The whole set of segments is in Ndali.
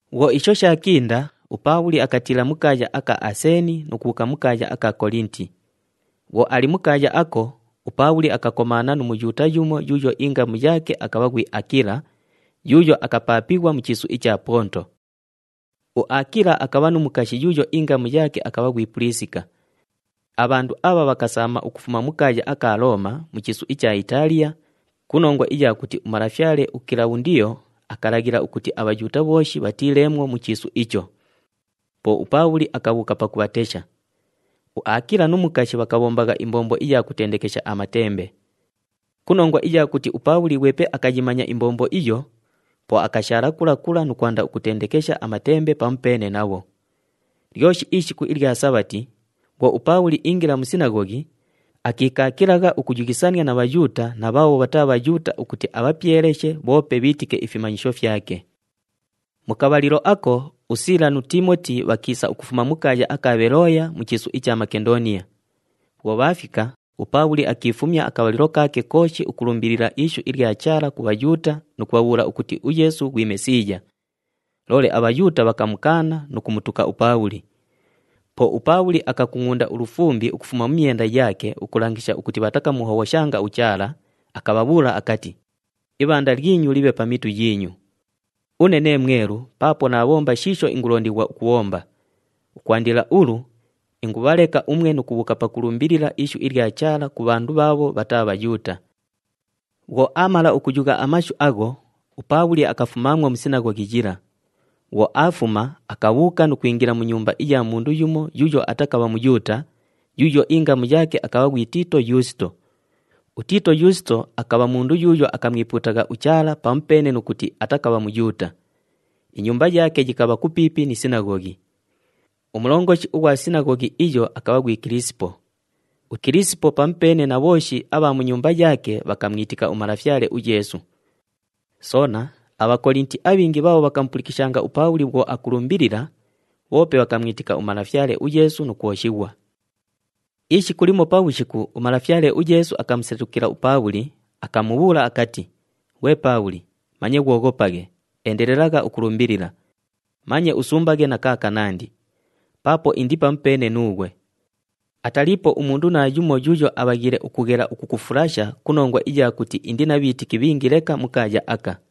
Bhwo isho shaakinda, uPaabhuli akatiila mu kaaya aka Aseeni nu kubhuuka mu kaaya aka Kolinti. Bhwo ali mu kaaya ako, uPaabhuli akakomaana nu Muyuuta yumo yuuyo ingamu yaake akabha ghwi Aakila, yuuyo akapaapighwa mu chiisu icha Ponto. UAakila akabha nu mukashi yuuyo ingamu yaake akabha ghwi Puliisika. Abhandu abha bhakasaama ukufuma mu kaaya aka Looma mu chiisu icha Itaaliya ku nongwa iya kuti umalafyale uKilabhundiyo akalaghila ukuti aBhayuuta bhooshi bhatiileemwo mu chiisu icho. Po uPaabhuli akabhuuka pakubhatesha. UAakila nu mukashi bhakabhombagha imbombo iya kutendekesha amatembe. Ku nongwa iya kuti uPaabhuli ghwepe akayimanya imbombo iyo, po akashaala kula kula nu kwanda ukutendekesha amatembe pamupeene nabho. Lyoshi ishiku ilya Sabhati, bhwo uPaabhuli iingila mu sinaghoghi, akiikaakilagha ukuyughisania na Bhayuuta na bhaabho bhataa Bhayuuta ukuti abhapyeleshe bhoope bhiitike ifimanyisho fyake. Mu kabhalilo ako, uSiila nu Tiimoti bhakiisa ukufuma mu kaaya aka Bhelooya mu chiisu icha Makendooniya. Bhwo bhaafika, uPaabhuli akiifumya akabhalilo kaake kooshi ukulumbilila ishu ilya Chaala ku Bhayuuta nu kubhabhuula ukuti uYeesu ghwi Mesiiya. Loole aBhayuuta bhakamukaana nu kumutuka uPaabhuli. Po uPaabhuli akakungʼunda ulufumbi ukufuma mu myenda yaake ukulangisha ukuti bhatakamuhobhoshanga uChaala, akabhabhuula akati, “Ibhanda lyinyu libhe pa mitu yiinyu! Une nee mwelu paapo naabhomba shiisho ingulondighwa ukubhomba. Ukwandila ulu, ingubhaleka umwe nu kubhuuka pakulumbilila ishu ilya Chaala ku bhandu bhaabho bhataa Bhayuuta.” Bhwo aamala ukuyugha amashu agho, uPaabhuli akafumaamwo mu sinaghoghi yila. Bhwo aafuma, akabhuuka nu kwingila mu nyumba iya mundu yumo yuuyo atakabha Muyuuta, yuuyo ingamu yaake akabha ghwi Tiito Yuusito. UTiito Yuusito akabha mundu yuuyo akamwipuutagha uChaala pamupeene nu kuti atakabha Muyuuta. Inyumba yaake yikabha kupiipi ni sinaghoghi. Umulongoshi ughwa sinaghoghi iyo akabha ghwi Kilisipo. UKilisipo pamupeene na bhooshi abha mu nyumba yaake bhakamwitika uMalafyale uYeesu. Soona, aBhakolinti abhingi bhaabho bhakamupulikishanga uPaabhuli bhwo akulumbilila, bhoope bhakamwitika uMalafyale uYeesu nu kwoshighwa. Ishiku limo pabhushiku, uMalafyale uYeesu akamusetukila uPaabhuli, akamubhuula akati, “Ghwe Paabhuli, manye ghwoghopaghe, endelelagha ukulumbilila. Manye usumbaghe na kaakanandi. Paapo indi pamupeene nuughwe. Ataliipo umundu naayumo yuuyo abhaghiile ukughela ukukufulasha ku nongwa iya kuti indi na bhiitiki bhingi leka mu kaaya aka.”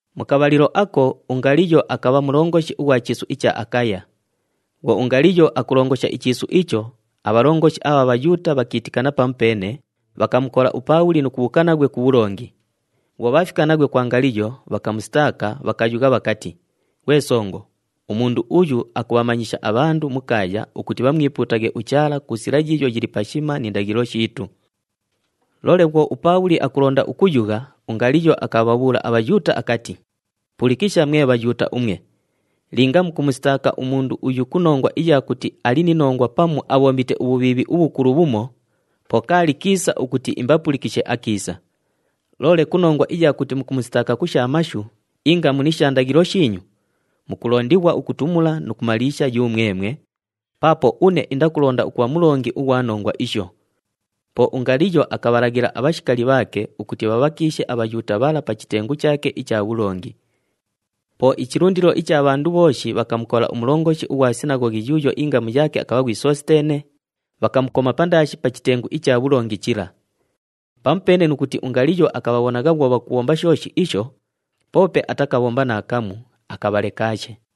Mu kabhalilo ako, uNgaliyo akabha mulongoshi ughwa chiisu icha Akaya. Bhwo uNgaliyo akulongosha ichiisu icho, abhalongoshi abha Bhayuuta bhakiitikana pamupeene, bhakamukola uPaabhuli nu kubhuuka naghwe ku bhulongi. Bhwo bhaafika naghwe kwa Ngaliyo, bhakamusitaaka, bhakayugha bhakati, “Ghwe songo, umundu uyu akubhamanyisha abhandu mu kaaya ukuti bhamwipuutaghe uChaala ku sila yiiyo yili pashima ni ndaghilo shiitu.” Loole bhwo uPaabhuli akulonda ukuyugha, uNgaliyo akabhabhuula aBhayuuta akati, “Pulikisha mwe Bhayuuta umwe! Linga mukumusitaaka umundu uyu ku nongwa iya kuti ali ni nongwa pamu abhombite ubhubhiibhi ubhukulu bhumo, po kaali kiisa ukuti imbapulikishe akiisa. Loole ku nongwa iya kuti mukumusitaaka ku sha mashu, ingamu ni sha ndaghilo shiinyu, mukulondighwa ukutumula nu kumaliisha yumwemwe, paapo une indakulonda ukubha mulongi ughwa nongwa isho.” Po uNgaliyo akabhalaghila abhashikali bhaake ukuti bhabhakiishe aBhayuuta bhala pa chitengu chaake icha bhulongi. Po ichilundilo icha bhandu bhooshi bhakamukola umulongoshi ughwa sinaghoghi yuuyo ingamu yaake akabha ghwi Sositeene, bhakamukoma pandaashi pa chitengu icha bhulongi chila. Pamupeene nu kuti uNgaliyo akabhabhonagha bhwo bhakubhomba shooshi isho, poope atakabhomba naakamu, akabhalekaashe.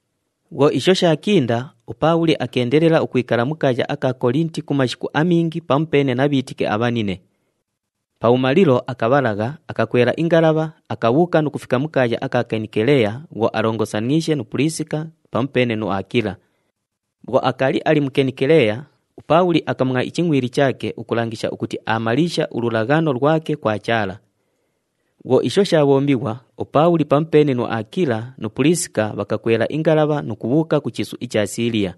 Bhwo isho shaakinda, uPaabhuli akeendelela ukwikala mu kaaya aka Kolinti ku mashiku amingi pamupeene na bhiitiki abhanine. Pabhumalilo, akabhalagha, akakwela ingalabha, akabhuuka nu kufika mu kaaya aka Kenikeleya bhwo alongosaniishe nu Puliisika pamupeene nu Aakila. Bhwo akaali ali mu Kenikeleya, uPaabhuli akamwa ichingʼwili chaake ukulangisha ukuti aamaliisha ululaghano lwake kwa Chaala. Bhwo isho shaabhombighwa, uPaabhuli pamupeene nu Aakila nu Puliisika bhakakwela ingalabha nu kubhuuka ku chiisu icha Siiliya.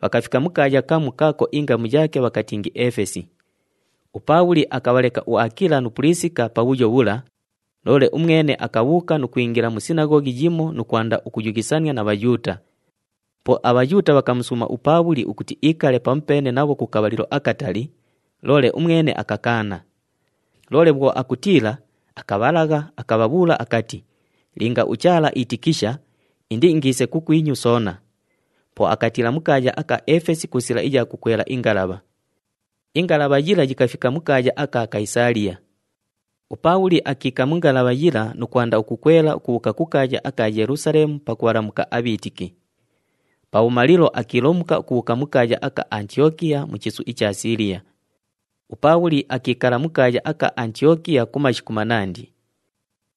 Bhakafika mu kaaya kamu kaako ingamu yaake bhakatingi Efesi. UPaabhuli akabhaleka uAakila nu Puliisika pabhuyo bhula, loole umwene akabhuuka nu kwingila mu sinaghoghi yimo nu kwanda ukuyughisania na Bhayuuta. Po aBhayuuta bhakamusuuma uPaabhuli ukuti iikale pamupeene nabho ku kabhalilo akatali, loole umwene akakaana. Loole bhwo akutiila, akabhalagha, akabhabhuula akati, “Linga uChaala iitikisha, indiingiise kukwinyu soona.” Po akatiila mu kaaya aka Efesi ku sila iya kukwela ingalabha. Ingalabha yila yikafika mu kaaya aka Kayisaaliya. UPaabhuli akiika mu ngalabha yila nu kwanda ukukwela ukubhuuka ku kaaya aka Yelusaleemu pakubhalamuka abhiitiki. Pabhumalilo akiilomuka ukubhuuka mu kaaya aka Antiyokiya mu chiisu icha Siiliya. UPaabhuli akiikala mu kaaya aka Antiyokiya ku mashiku manandi.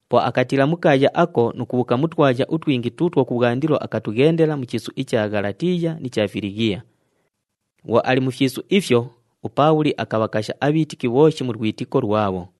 Po akatiila mu kaaya ako nu kubhuuka mu twaya utwingi tuutwo kubhwandilo akatughendela mu chiisu icha Ghalatiiya ni cha Filighiya. Bhwo ali mu fyisu ifyo, uPaabhuli akabhakasha abhiitiki bhooshi mu lwitiko lwabho.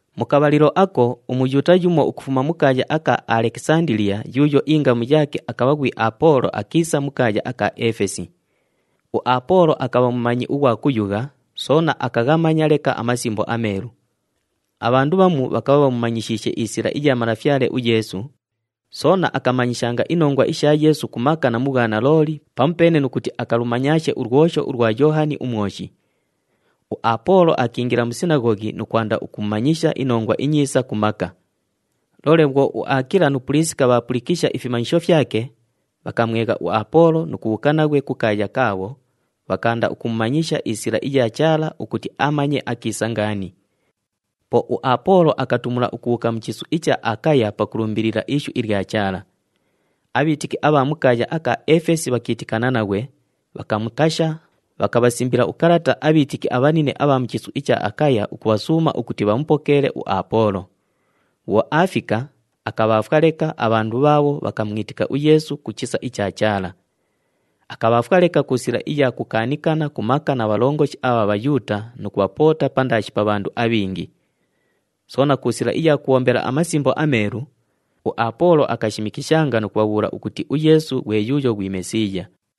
Mu kabhalilo ako, uMuyuuta yumo ukufuma mu kaaya aka Alekisandiliya yuuyo ingamu yaake akabha ghwi Apoolo akiisa mu kaaya aka Efesi. UApoolo akabha mumanyi ughwa kuyugha, soona akaghamanya leka aMasimbo aMeelu. Abhandu bhamu bhakabha bhamumanyishiishe isila iya Malafyale uYeesu, soona akamanyishanga inongwa isha Yeesu ku maka na mu bhwanalooli pamupeene nu kuti akalumanyaashe ulwosho ulwa Yoohani uMwoshi. UApoolo akiingila mu sinaghoghi nu kwanda ukumanyisha iNongwa iNyiisa ku maka. Loole bhwo uAakila nu Puliisika bhaapulikisha ifimanyisho fyake, bhakamwegha uApoolo nu kubhuuka naghwe kukaaya kaabho, bhakaanda ukumumanyisha isila iya Chaala ukuti amanye akiisa ngaani. Po uApoolo akatumula ukubhuuka mu chiisu icha Akaya pakulumbilila ishu ilya Chaala. Abhiitiki abha mu kaaya aka Efesi bhakiitikana naghwe, bhakamukasha, bhakabhasimbila ukalata abhiitiki abhanine abha mu chiisu icha Akaya ukubhasuuma ukuti bhamupokeele uApoolo. Bhwo aafika, akabhaafwa leka abhandu bhaabho bhakamwitika uYeesu ku chisa icha Chaala. Akabhaafwa leka ku sila iya kukaanikana ku maka na bhalongoshi abha Bhayuuta nu kubhapoota pandaashi pa bhandu abhingi. Soona ku sila iya kubhombela aMasimbo aMeelu, uApoolo akashimikishanga nu kubhabhuula ukuti uYeesu ghwe yuuyo ghwi Mesiiya.